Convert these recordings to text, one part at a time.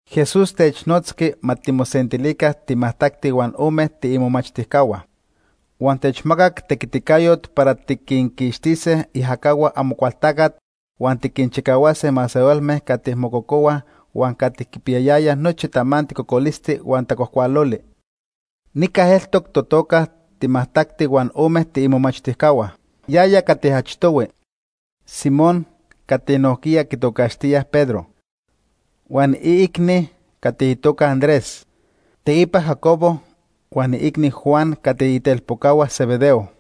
Jesús technotzqui ma timosentilica timajtacti huan ome tiimomachtijcahua. Huan techmacac tequiticayot para tiquinquixtise iajacahua Amocualtacat huan tiquinchicahuase masehualme cati mococohuaj huan cati quipiyayayaj nochi tamanti cocolisti huan tacuajcualoli. Nica eltoc totoca timajtacti huan ome tiimomachtijcahua. Yaya cati achtohui: Simón cati nojquiya quitocaxtíaj Pedro, huan iicni cati itoca Andrés, teipa Jacobo huan iicni, Juan, cati itelpocahua Zebedeo.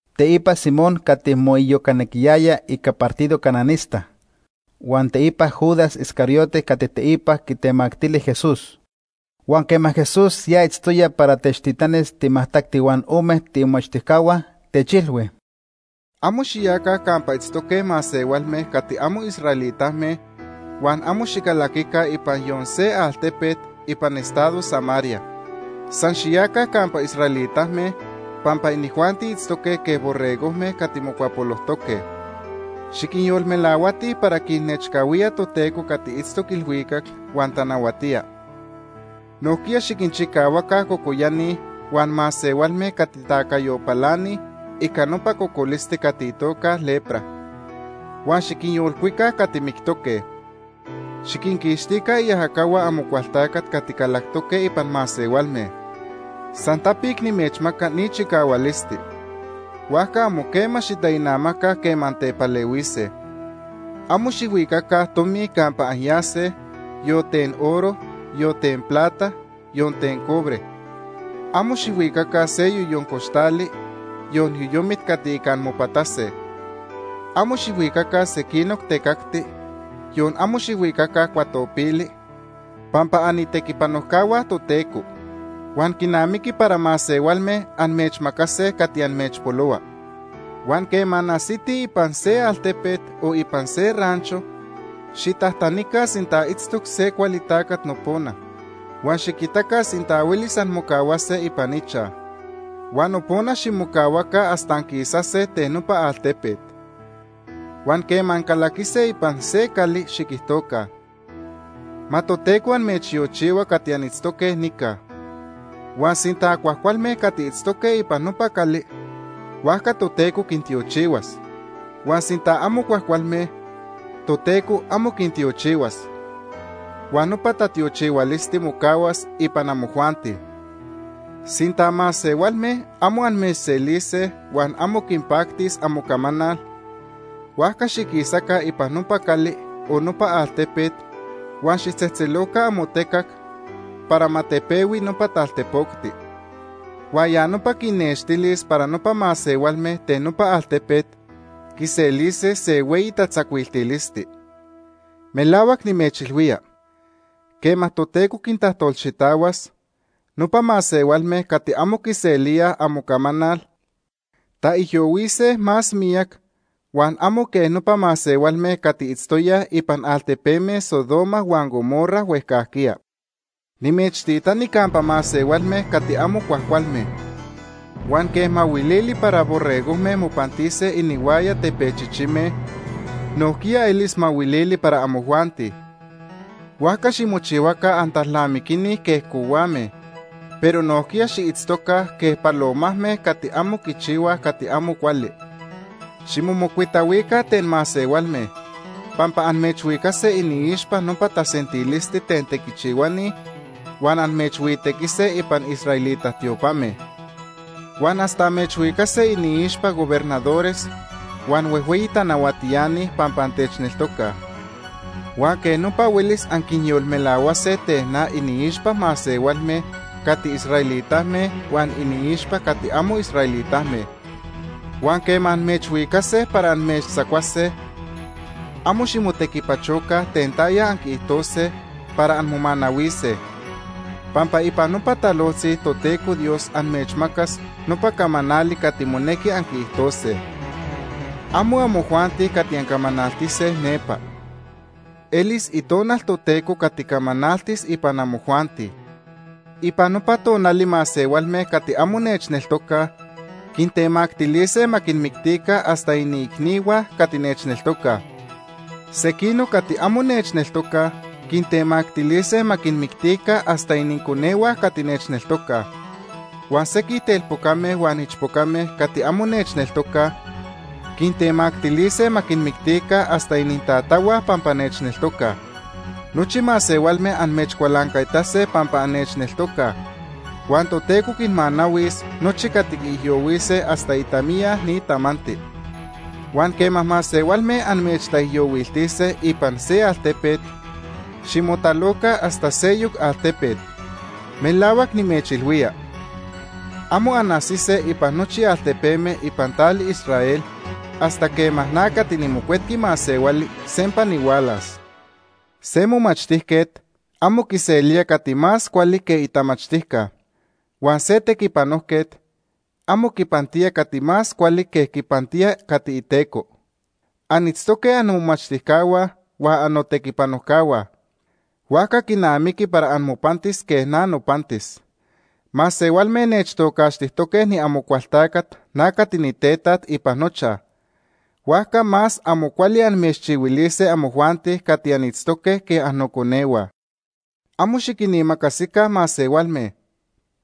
teipa Simón cati moiyocanequiyaya ica partido cananista, huan teipa Judas Iscariote cati teipa quitemactili Jesús. Huan quema Jesús ya itztoya para techtitanis timajtacti huan ome tiimomachtijcahua, techilhui: “Amo xiyaca campa itztoque masehualme cati amo israelitame huan amo xicalaquica ipan yon se altepet ipan estado Samaria. San xiyaca campa israelitame, pampa inijuanti itztoque quej borregojme cati mocuapolojtoque. Xiquinyolmelahuatij para quinnechcahuía Toteco cati itztoc ilhuicac huan tanahuatía. Nojquiya xiquinchicahuaca cocoyani huan masehualme cati tacayo palanij ica nopa cocolisti cati itoca lepra. Huan xiquinyolcuica cati mictoque. Xiquinquixtica iajacahua Amocualtacat cati calactoque ipan masehualme. San tapic nimechmaca ni chicahualisti, huajca amo quema xitainamaca quema antepalehuise. “Amo xijhuicaca tomi campa anyase, yon ten oro, yon ten plata, yon ten cobre. Amo xijhuicaca se yoyon coxtali, yon yoyomit cati ica anmopatase. Amo xijhuicaca sequinoc tecacti, yon amo xijhuicaca cuatopili, pampa anitequipanojcahua Toteco huan quinamiqui para masehualme amechmacase cati amechpolohua. “Huan quema anajsitij ipan se altepet o ipan se rancho, xitajtanica sinta itztoc se cuali tacat nopona, huan xiquitaca sinta huelis anmocahuase ipan ichaj. Huan nopona ximocahuaca hasta anquisase ten nopa altepet. Huan quema ancalaquise ipan se cali, xiquijtoca: ‘Ma Toteco amechtiochihua cati anitztoque nica.’ Huan sinta cuajcualme cati itztoque ipan nopa cali, huajca Toteco quintiochihuas; huan sinta amo cuajcualme, Toteco amo quintiochihuas. Huan nopa tatiochihualisti mocahuas ipan amojuanti. Sinta masehualme amo amechselise huan amo quinpactis amocamanal, huajca xiquisaca ipan nopa cali, o nopa altepet, huan xijtzejtzeloca amotecac para ma tepehui nopa taltepocti. Huan ya nopa quinnextilis para nopa masehualme ten nopa altepet quiselise se hueyi tatzacuiltilisti. Melahuac nimechilhuía, quema Toteco quintajtolxitahuas, nopa masehualme cati amo quiselíaj amocamanal, taijyohuise más miyac huan amo quej nopa masehualme cati itztoyaj ipan altepeme Sodoma huan Gomorra huejcajquiya. “Nimechtitani campa masehualme cati amo cuajcualme. Huan quej mahuilili para borregojme mopantise inihuaya tepechichime, nojquiya elis mahuilili para amojuanti. Huajca ximochihuaca antalnamiquini quej cohuame, pero nojquiya xiitztoca quej palomajme cati amo quichihuaj cati amo cuali. Ximomocuitahuica ten masehualme, pampa amechhuicase iniixpa nopa tasentilisti ten tequichihuani huan amechhuitequise ipan israelita tiopame. Huan hasta amechhuicase iniixpa gobernadores huan huejhueyi tanahuatiani pampa antechneltocaj. Huan quej nopa huelis anquinyolmelahuase ten na iniixpa masehualme cati israelitame huan iniixpa cati amo israelitame. Huan quema amechhuicase para amechtzacuase, amo ximotequipachoca ten taya anquiijtose para anmomanahuise, pampa ipan nopa talojtzi Toteco Dios amechmacas nopa camanali cati monequi anquiijtose. Amo amojuanti cati ancamanaltise nepa. Elis Itonal Toteco cati camanaltis ipan amojuanti. “Ipan nopa tonali masehualme cati amo nechneltocaj quintemactilise ma quinmictica hasta iniicnihua cati nechneltocaj. Sequinoc cati amo nechneltocaj quintemactilise ma quinmictica hasta ininconehua cati nechneltocaj. Huan sequij telpocame huan ichpocame cati amo nechneltocaj quintemactilise ma quinmictica hasta inintatahua pampa nechneltocaj. Nochi masehualme amechcualancaitase pampa annechneltocaj, huan Toteco quinmanahuis nochi cati quiijyohuise hasta itamiya ni tamanti. Huan quema masehualme amechtaijyohuiltise ipan se altepet, ximotaloca hasta seyoc altepet. Melahuac nimechilhuía, amo anajsise ipan nochi altepeme ipan tali Israel hasta quema na cati niMocuetqui Masehuali sempa nihualas. “Se momachtijquet amo quiselía cati más cuali que itamachtijca. Huan se tequipanojquet amo quipantía cati más cuali que quipantía cati iteco. Anitztoque annomomachtijcahua huan annotequipanojcahua, huajca quinamiqui para amopantis quej na nopantis. Masehualme nechtocaxtijtoque niAmocualtacat Nopa masehualme quitocaxtijque Amocualtacat, Beelzebú. na cati nitetaj ipan nochaj, huajca más amo cuali amechchihuilise amojuanti cati anitztoque quej annoconehua. “Amo xiquinimacasica masehualme,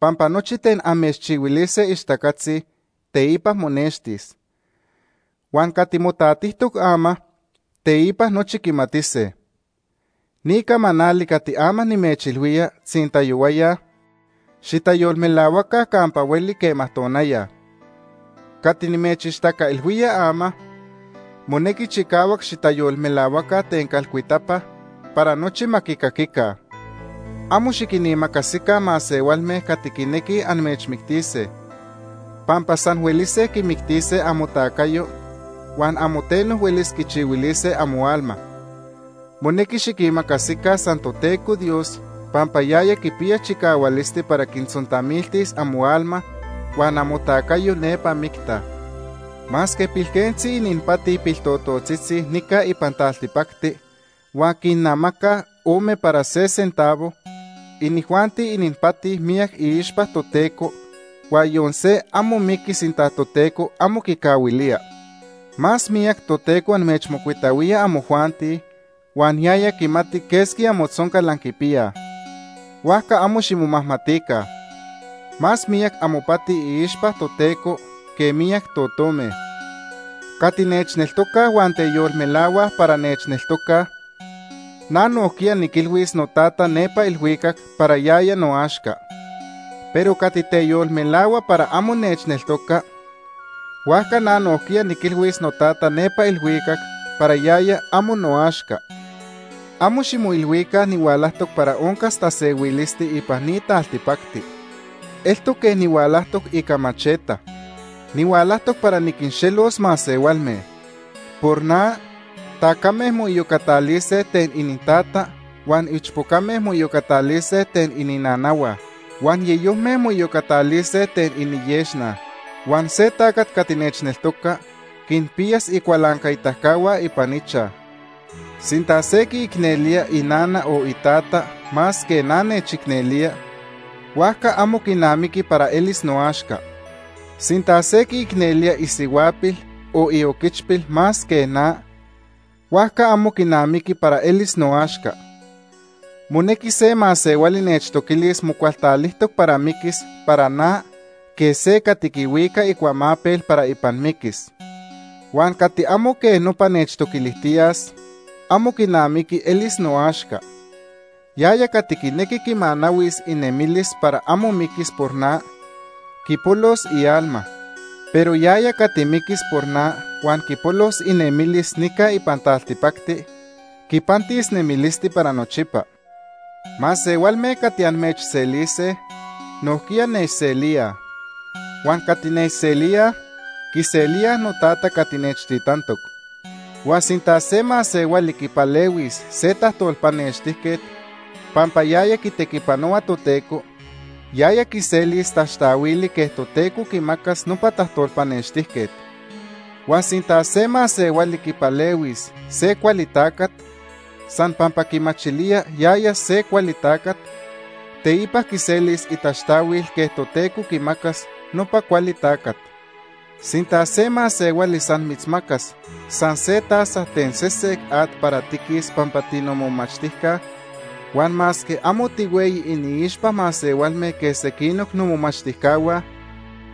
pampa nochi ten amechchihuilise ixtacatzi, teipa monextis. Huan cati motatijtoc ama, teipa nochi quimatise. Ni camanali cati ama nimechilhuía tzintayohuaya, xitayolmelahuaca campa hueli quema tonaya. Cati nimechixtacailhuía ama, monequi chicahuac xitayolmelahuaca ten calcuitapa para nochi ma quicaquica. Amo xiquinimacasica masehualme cati quinequij amechmictise, pampa san huelise quimictise amotacayo, huan amo teno huelis quichihuilise amoalma. Monequi xiquimacasica san Toteco Dios pampa yaya quipiya chicahualisti para quitzontamiltis amoalma huan amotacayo nepa micta. “Masque pilquentzi ininpati piltototzitzi nica ipan taltipacti huan quinnamacaj ome para se centavo, inijuanti ininpati miyac iixpa Toteco huan yon se amo miqui sinta Toteco amo quicahuilía. Más miyac Toteco amechmocuitahuía amojuanti huan yaya quimati quesqui amotzoncal anquipiyaj. Huajca amo ximomajmatica. Más miyac amopati iixpa Toteco que miyac totome. “Cati nechneltoca huan teyolmelahua para nechneltoca, na nojquiya niquilhuis noTata nepa ilhuicac para yaya noaxca. Pero cati teyolmelahua para amo nechneltoca, huajca na nojquiya niquilhuis noTata nepa ilhuicac para yaya amo noaxca. “Amo ximoilhuica nihualajtoc para oncas tasehuilisti ipan ni taltipacti. Eltoc quej nihualajtoc ica macheta. Nihualajtoc para niquinxelos masehualme. Por na tacame moiyocatalise ten inintata, huan ichpocame moiyocatalise ten ininanahua. Huan yeyojme moiyocatalise ten iniyexna. Huan se tacat cati nechneltoca quinpiyas icualancaitacahua ipan ichaj. “Sinta se quiicnelía inana o itata más que na nechicnelía, huajca amo quinamiqui para elis noaxca. Sinta se quiicnelía isihuapil o ioquichpil más que na, huajca amo quinamiqui para elis noaxca. Monequi se masehuali nechtoquilis mocualtalijtoc para miquis para na quej se cati quihuica icuamapel para ipan miquis. Huan cati amo quej nopa nechtoquilijtiyas, amo quinamiqui elis noaxca. Yaya cati quinequi quimanahuis inemilis para amo miquis por na, quipolos ialma. Pero yaya cati miquis por na huan quipolos inemilis nica ipan taltipacti, quipantis nemilisti para nochipa. “Masehualme cati amechselise, nojquiya nechselíaj. Huan cati nechselía, quiselía noTata cati nechtitantoc. Huan sinta se masehuali quipalehuis se tajtolpanextijquet pampa yaya quitequipanohua Toteco, yaya quiselis taxtahuili quej Toteco quimacas nopa tajtolpanextijquet. Huan sinta se masehuali quipalehuis se cuali tacat, san pampa quimachilía yaya se cuali tacat, teipa quiselis itaxtahuil quej Toteco quimacas nopa cuali tacat. Sinta se masehuali san mitzmacas san se taza ten sesec at para tiquis pampa tinomomachtijca, huan masque amo tihueyi iniixpa masehualme quej sequinoc nomomachtijcahua,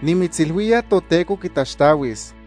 nimitzilhuía Toteco quitaxtahuis.”